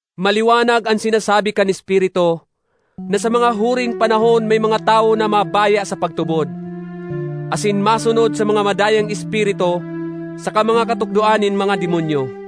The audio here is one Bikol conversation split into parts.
Maliwanag an sinasabi kan Espiritu na sa mga huring panahon may mga tawo na mabaya sa pagtubod, asin masunod sa mga madayang espiritu saka mga katukdoan nin mga demonyo.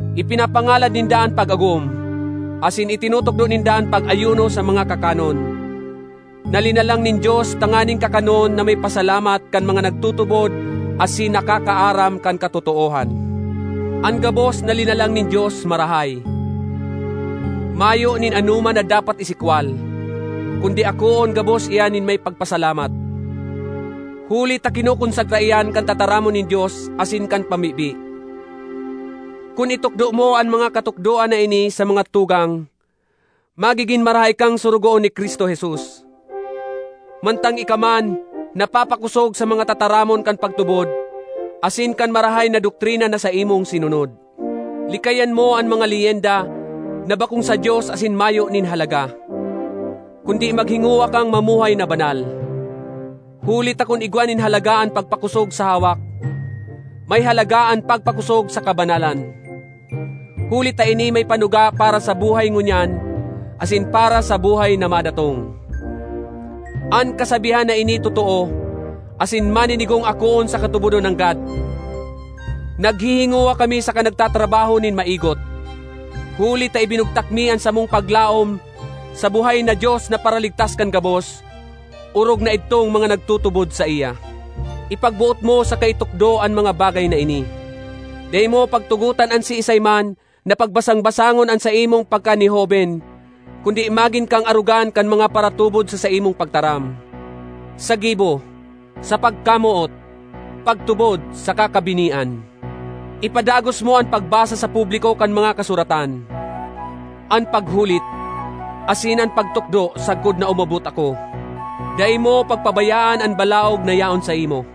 Ipinapangalad ninda an pag-agom asin itinutukdo ninda an pag-ayuno sa mga kakanon, na linalang nin Dios tanganing kakanon na may pasalamat kan mga nagtutubod asin nakakaaram kan katotoohan. An gabos na linalang nin Dios marahay; mayo nin anoman na dapat isikwal, kundi akoon gabos iyan nin may pagpasalamat. Huli ta kinokonsagra iyan kan tataramon nin Dios asin kan pamibi. Kun itukdo mo an mga katukdoan na ini sa mga tugang, magigin marahay kang sorogoon ni Cristo Jesus, mantang ika man napapakosog sa mga tataramon kan pagtubod asin kan marahay na doktrina na saimong sinunod. Likayan mo an mga leyenda na bakong sa Dios asin mayo nin halaga, kundi maghingowa kang mamuhay na banal. Huli ta kun igwa nin halaga an pagpakosog sa hawak, may halaga an pagpakosog sa kabanalan, huli ta ini may panuga para sa buhay ngunyan asin para sa buhay na madatong. An kasabihan na ini totoo asin maninigong akoon saka tubodon nanggad. Naghihingowa kami saka nagtatrabaho nin maigot, huli ta ibinugtak mi an samong paglaom sa buhay na Dios na Paraligtas kan gabos, orog na idtong mga nagtutubod saiya. Ipagboot mo saka itukdo an mga bagay na ini. Dai mo pagtugotan an siisay man na pagbasang-basangon an saimong pagkanihoben, kundi magin kang arogan kan mga paratubod sa saimong pagtaram, sa gibo, sa pagkamoot, pagtubod, saka kabinian. Ipadagos mo an pagbasa sa publiko kan mga Kasuratan, an paghulit, asin an pagtukdo, sagkod na umabot ako. Dai mo pagpabayaan an balaog na yaon saimo,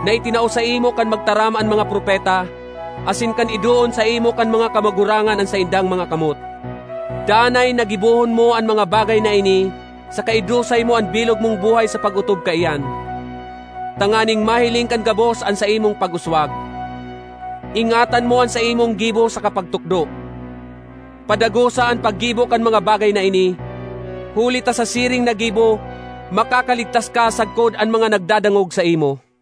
na itinao saimo kan magtaram an mga propeta asin kan idoon saimo kan mga kamagurangan an saindang mga kamot. Danay ba (na) gibohon mo an mga bagay na ini saka idusay mo an bilog mong buhay sa pag-otob kaiyan, tanganing mahiling kan gabos an saimong pag-uswag. Ingatan mo an saimong gibo saka pagtukdo. Padagosa an paggibo kan mga bagay na ini, huli ta sa siring na gibo makakaligtas ka sagkod an mga nagdadangog saimo.